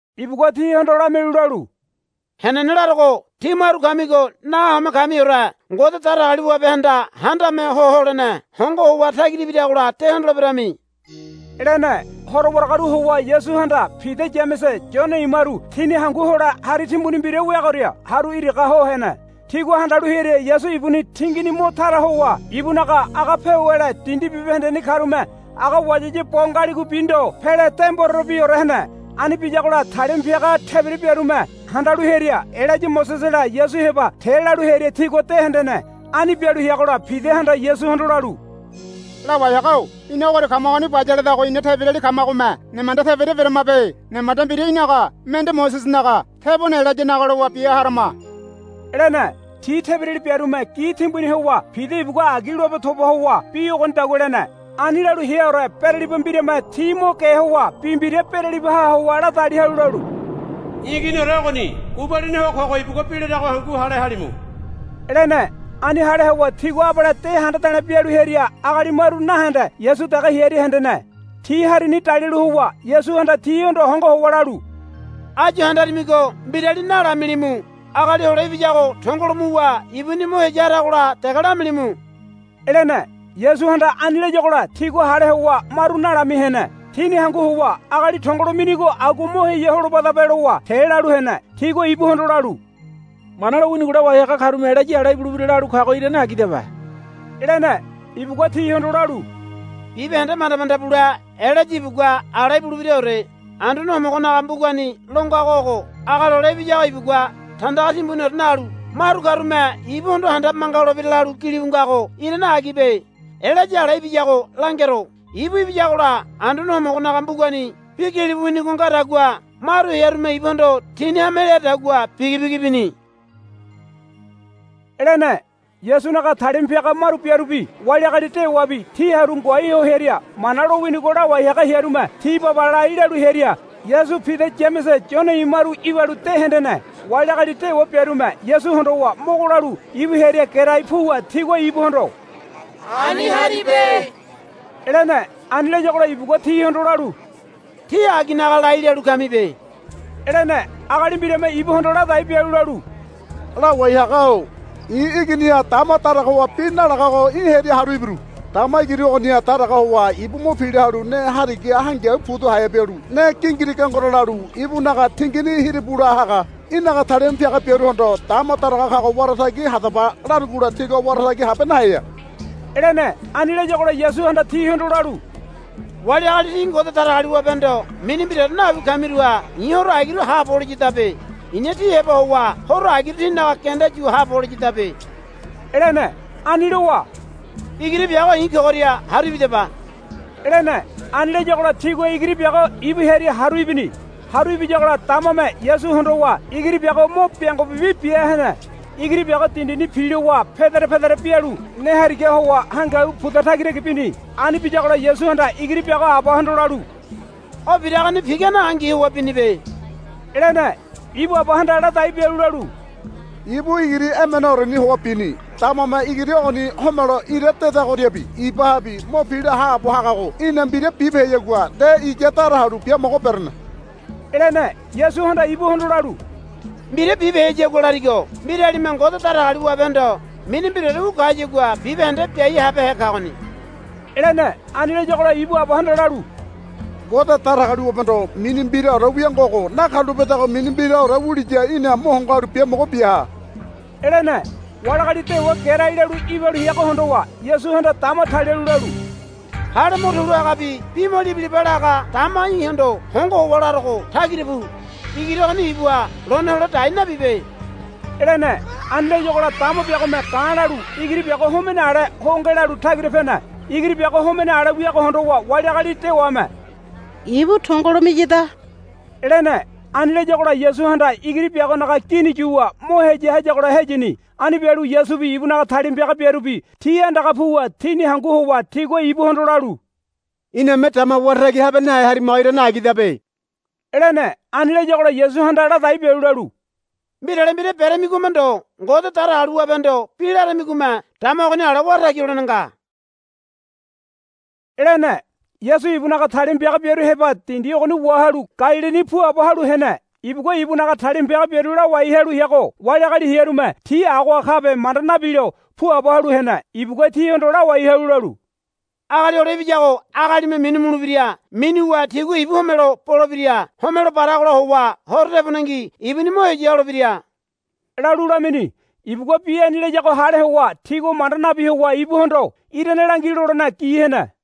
Ibugua tihondo lamialu lalu, Henene larogo. Tí maru kamigo nahome kamiore Ngode Datagaliwabehanda Handame Ho Holene hongo howa tagira ibiragola de hondoleberami, lene. Horo waragaru howa Yasuhanda Pida Yamese Yone imaru tini hangu hole hari timbuni mbira weagoria haru iraga ho hene. Tigua handalu hearia Yasu ibuni tingini mo tara howa ibunaga aga pewele dindi bibahendeni karume aga wayawaya bo ngaligobi ndo pele de mborerebiore hene. Ani biyagola talima piaga tebira biarume handalu hearia Elaya Mosesela Yasu heba te lalu hearia tigua de hendene. Ani bialu heagola Pidahanda Yasuhondo lalu, Lawai haga-o ina ogoria kamagoni bayaledago ina tebirali kamagome nemanda tebira beramabe. Nemanda mbira í̠naga mende Mosesenaga tebone Elayanaga lowa bia harama, lene. Ti tebirali biarume gi timbuni howa Pida ibugua agi loabe toba howa bi ogonidagua lene. Ani lalu heaore beraliba mbirame ti mo ge howa bi mbira beralibaha howa ladali halu lalu, I̱ Iginiore ogoni gubalini ho kogo ibugua bi larago hangu hale halimu, lene. Ani hale howa tigua abale de handa de̱le̱ bialu hearia agali maru nahende Yasu dege hearia hendene. Ti harini dalialu howa Yasuhanda tihondo hongo howa lalu, Áyu handarimigo mbirali nalamilimu. Agali Hole Ibiyago tongolo muwa ibuni mo heya haragola dege lamilimu, lene. Yasuhanda ani layagola tigua hale howa maru nalami hene. Tini hangu howa, Agali tongolo minigo agua mo heya holobadabe, lowa te lalu hene. Tigua ibuhondo lalu, Mana lowinigo lawai haga karume Elaya ala ibulebira lalu kago irane agidabe, lene. Ibugua tihondo lalu, Bibahende manda manda bule Elaya ibugua ala ibulebiraore. Anduane Homogonaga mbugani lo ngago ogo, Agali Hole Ibiyago ibugua tandaga timbuniore nalu maru karume ibuhondo handabe manga holebira, lalu gilibu ngago irane agibe. Elaya ala ibiyago langero. Ibu ibiyagola Anduane Homogonaga mbugani bi gilibu winigo ngadagua maru hearume ibuhondo tini hame leadagua bigibigi bini, lene. Yasunaga talima piaga maru biarubi wali agali dewabi ti haru ngoai ho hearia Mana lowinigo lawai haga hearume ti baba lai lalu hearia Yasu Pida Yamese Yone imaru ibalu de hendene. Wali agali dewa biarume Yasu hondowa mogo lalu ibu hearia gerai puwa tigua ibuhondo, Ani haribe, lene. Ani layagola ibugua tihondo lalu, Tí aginaga lai lalu kamibe, lene. Agali mbirame ibuhondo ladai bialu lalu, Lawai haga-o i̱ iginiha dama daraga howa bi nalagago í̠ heria haru ibiru. Dama igiri ogoniha daraga howa ibu mo pila halu ne harigaha hangiau pudu haea bialu ne gingiri gengero lalu ibunaga tingini hiribula haga. Í̠naga talima piaga biaruhondo, Dama daraga kago wara tagi hadaba larugola tigua wara tagi habe naheya, lene. Ani layagola Yasuhanda tihondo lalu, Wali agali tí Ngode Datagaliwabehondo mini mbiraore nawi kamiruha i̱ horo agiru haabo holiyadabe. I̱na tí heba howa horo agiru tínaga genda yu haabo holiyadabe, lene. Ani lowa, Igiri biago i̱ kogoria haru ibidaba, lene. Ani layagola tigua igiri biago ibu hearia haru ibini. Haru ibiyagola damame Yasu hondowa igiri biago mo biango bibi bia hene. Igiri biago dindini pilowa pedere pedere bialu ne harigaha howa hangiau puda tagitagi bini. Ani biyagola Yasuhanda igiri biago abahondo lalu, O biragoni pigane angi howa binibe, lene. Ibu abahanda ladai bialu lalu, Ibu igiri emeneoreni howa bini. Damame igiri ogoni homelo ira dedagoriabi ibahabi mo pila haabo hagago í̠na mbira bibeheyagua nde iya dara halu biamogo berene, lene. Yasuhanda ibuhondo lalu, Mbira bibeheyagua larigo mbiralime Ngode Datagaliwabehondo mini mbiraore wu kayagua bibahende biai habehe kagoni, lene. Ani layagola ibu abahanda lalu, Ngode Datagaliwabehondo mini mbiraore wia ngogo nakarulapedago mini mbiraore wuliya í̠na mo hongo halu biamogo biaha, lene. Wali agali dewa gerai lalu ibalu heago hondowa Yasuhanda dama talialu lalu, Hale mo tulu hagabi bi mo libilaba laga dama í̠hondo hongo howa larogo tagira pu. Igiri ogoni ibuha lone hole dai nabibe, lene. Ani layagola dama biagome ga̱ lalu igiri biago homene ale ho ngelalu tagira pene. Igiri biago homene ale wiago hondowa wali agali dewame, Ibu tongolo miyada, lene. Ani layagola Yasuhanda igiri biagonaga gini yuwa mo heya hayagola heyini. Ani bialu Yasubi ibunaga talima piaga biarubi ti andaga puwa tini hangu howa tigua ibuhondo lalu, Iname dama wara tagi habe nahe harimago irane agidabe, lene. Ani layagola Yasuhanda ladai bialu lalu, Mbirale mbira beremigome ndo Ngode Datagaliwabehondo bi laramigome dama ogoni ale wara tagi holene nga, lene. Yasu ibunaga talima piaga biaru heba dindi ogoni wahalu Galilini puabo halu hene. Ibugua ibunaga talima piaga biaru lawai halu heago wali agali hearume ti agoha kabe manda nabilo puabo halu hene. Ibugua tihondo lawai halu lalu, Agali Hole Ibiyago agalime minu mulebira. Minuwa tigua ibu homelo bolebira. Homelo baragola howa horo tebonengi ibuni mo heya holebira, lalu lamini. Ibugua bi ani layago hale howa tigua manda nabi howa ibuhondo, Irane langi, lolene gi hene.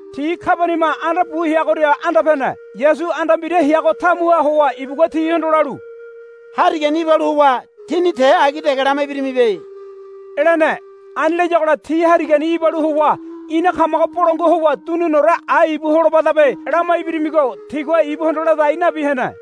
Ti Kabaniama anda bu heagoria anda pene. Yasu anda mbira heago tamuha howa ibugua tihondo lalu, Harigani ibalu howa tíni te agi dege lama ibirimibe, lene. Ani layagola ti harigani ibalu howa, Ina kamago bolangua howa duniniore ai ibu holobadabe, lama ibirimigo tigua ibuhondo ladai nabi hene.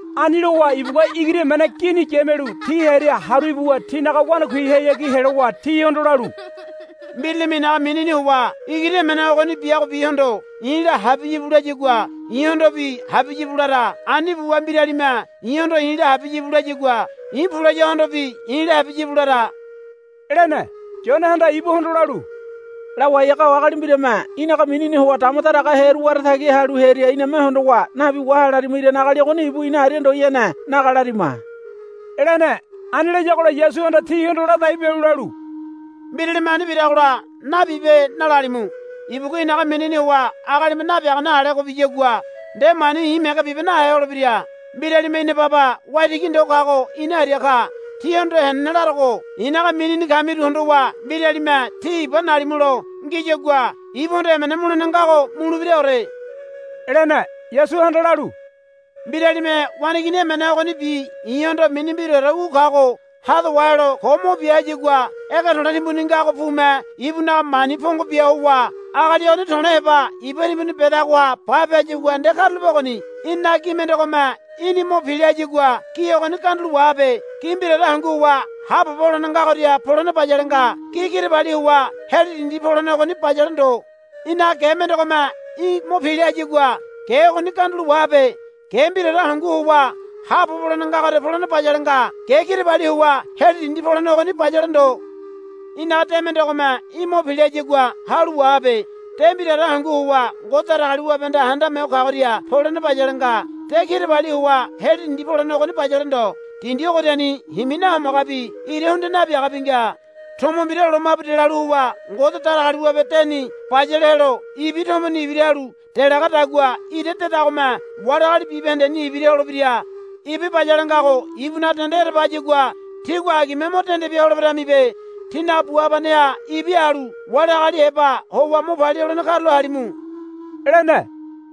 Ani lowa ibugua igiri emene gini yamialu ti hearia haru ibuwa tinaga wanakuihayagi helowa tihondo lalu, Mbiralime i̱naga minini howa igiri emene ogoni biagobihondo, I̱la habiya íbu, layagua i̱hondobi, Habiya íbu, lara. Ani buwa mbiralime i̱hondo, I̱la habiya íbu, layagua i̱, Pu, layagohondobi, I̱la habiya íbu, lara, lene. Yonehanda ibuhondo lalu, Lawai haga-o agali mbirame í̠naga minini howa dama daragahe hearu wara tagi halu hearia iname hondowa, Nabi waha, larima. Irane agali ogoni ibu ina aria ndoyanenaga lamirima, lene. Ani layagola Yasuhanda tihondo ladai bialu lalu, Mbiralime ani biragola, Nabibe, nalalimu. Ibugua i̱naga minini howa agalime nabiagane alego biyagua nde mani i̱ mege bibe nahe holebira. Mbiralime ina baba waitigi ndo kago ina aria ka. Tíhondo henene larogo i̱naga minini kamiru hondowa mbiralime tí iba nalimulo ngiyagua ibuhondo emena mulene ngago mulebiraore, lene. Yasuhanda lalu, Mbiralime waneigini emene ogonibi i̱hondo mini mbiraore wu kago hado wahelo ko mo bia hayagua ege to̱le̱ timbuni ngago pume ibunaga mani pongo bia howa agali ogoni to̱le̱ heba iba timbuni bedagoha bape hayagua nde karulape ogoni. Í̠ninaga gi mendegome í̠ni mo pila hayagua gi ogoni gandulo wahabe. Gi mbiraore hangu howa haabobo holene ngagoria polene bayale nga. Gi kirabali howa heli dindi polene ogoni bayale ndo. Í̠naga ge mendegome í̠ mo pila hayagua ge ogoni gandulo wahabe. Ge mbiraore hangu howa haabobo holene ngagoria polene bayale nga. Ge kirabali howa heli dindi polene ogoni bayale ndo. Í̠naga de mendegome í̠ mo pila hayagua halu wahabe. De mbiraore hangu howa Ngode Datagaliwabehanda Handame Ho Kagoria polene bayale nga. De kirabali howa heli dindi polene ogoni bayale ndo. Dindi ogoriani himi nahomagabi ira hundia nabiagabi nga. Tomo mbira lomabu delalu howa Ngode Datagaliwabe deni bayale helo ibi tomoni ibira halu delagadagua ira dedagome wali agali bibahendeni ibira holebira. Ibi bayale ngago ibunaga dende ereba hayagua tígua agime mo dende bia holeberamibe. Tínaga bu habaneha ibi halu wali agali heba howa mo palia holene karulo halimu, lene.